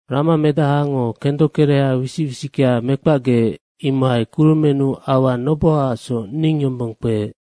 Ramamedahango kendokereha wisic wisickea mekpacgeec, imohai kurumennu aua nobohaacsoc ning yombong kpeec.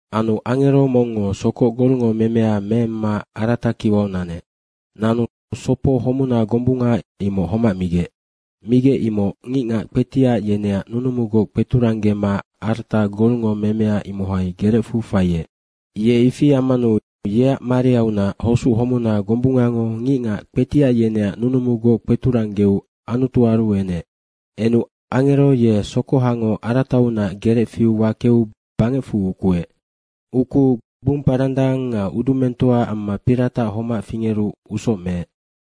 Anu angero mongngo sokoc golngo memea meemma arata kiwau nanec. Nanu sopo homuna gombunga imoc homac migec. Migec imoc ngicngac kpetiac yeneac nunumugoc kpeturanggema arata golngo memea, imohai gerecfu faiec. Ye ifi ammanu yeac mariaunac hosuc homuna gombungango ngicngac kpetiac yeneac nunumugoc kpeturanggeu Anutuaru enec. Enu angero ye sokohango arataunac gerec fiu wakeu bangecfu ukuec. Ukuu gbumparandang nga udumengtoa amma piratac homac fingeru usoc meec.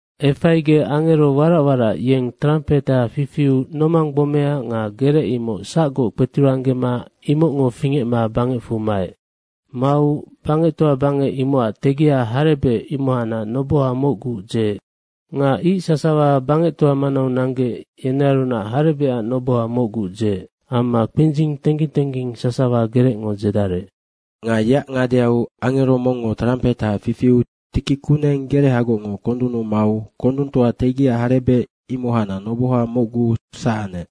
Efaigec angero warac warac yeng trampeha fifiu nomang gbomea nga gerec, imoc sacgoc kpeturanggema imocngo fingecma bangecfu maec. Mau bangectoa bangec, imocac tegia harebec imohacnac noboha mocgu (⅓) dzeec nga ic sasawa bangectoa imocac manau nanggec, yenearunac harebecac noboha mocgu (⅓) dzeec amma kpindzing tengging tengging sasawa gerecngo dzedarec. Nga yeac ngadeau angero mongngo trampeha fifiu tiki kuneng gerehagocngo kondunnu mau kondungtoa tegia harebec imohacnac noboha mocgu (⅓) sac anec.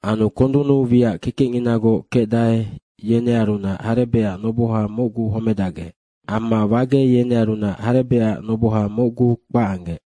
Anu kondunnu wiac kekecnginagoc kecdae, yenearunac harebecac noboha mocgu (⅓) homedacgec amma wage yenearunac harebecac noboha mocgu (⅓) kpac anggec.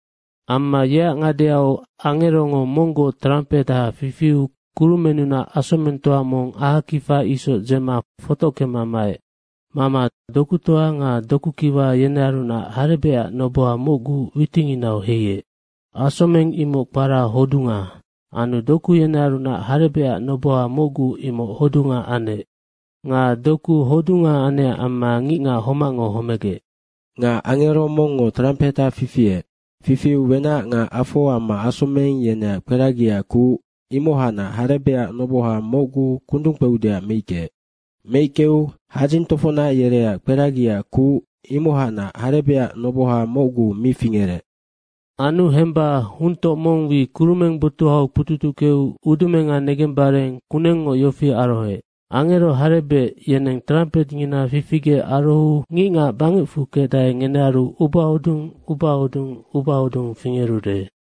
Amma yeac ngadeau angerongo monggoc trampeha fifiu kurumennunac asomengtoa mong ahakifa isoc dzema fotockema maec. Mama dokutoa nga dokukiwa yenearunac harebecac noboha mocgu (⅓) witinginau heiec. Asomeng imoc kpara Hodunga. Anu doku yenearunac harebecac noboha mocgu (⅓) imoc hodunga anec. Nga doku hodunga anecac amma ngicngac homacngo homegec. Nga angero mongngo trampeha fifiec. Fifiu wenac nga afo amma asomeng yeneac kperagiaac kuc imohacnac harebecac noboha mocgu (⅓) kundung kpeudeac meickeec. Meickeu hadzing tofocnac yereac kperagiaac kuc imohacnac harebecac noboha mocgu (⅓) mi fingerec. Anu hemba huntoc mong wi kurumeng botuhau kpututuckeu ubaudumenga negembare kunengngoc yofi arohoec, “Angero harebec yeneng trampetngina fifigec arohou ngicngac bangecfu kecdae, ngenearu ubahodung, ubahodung, ubahodung fingerude.”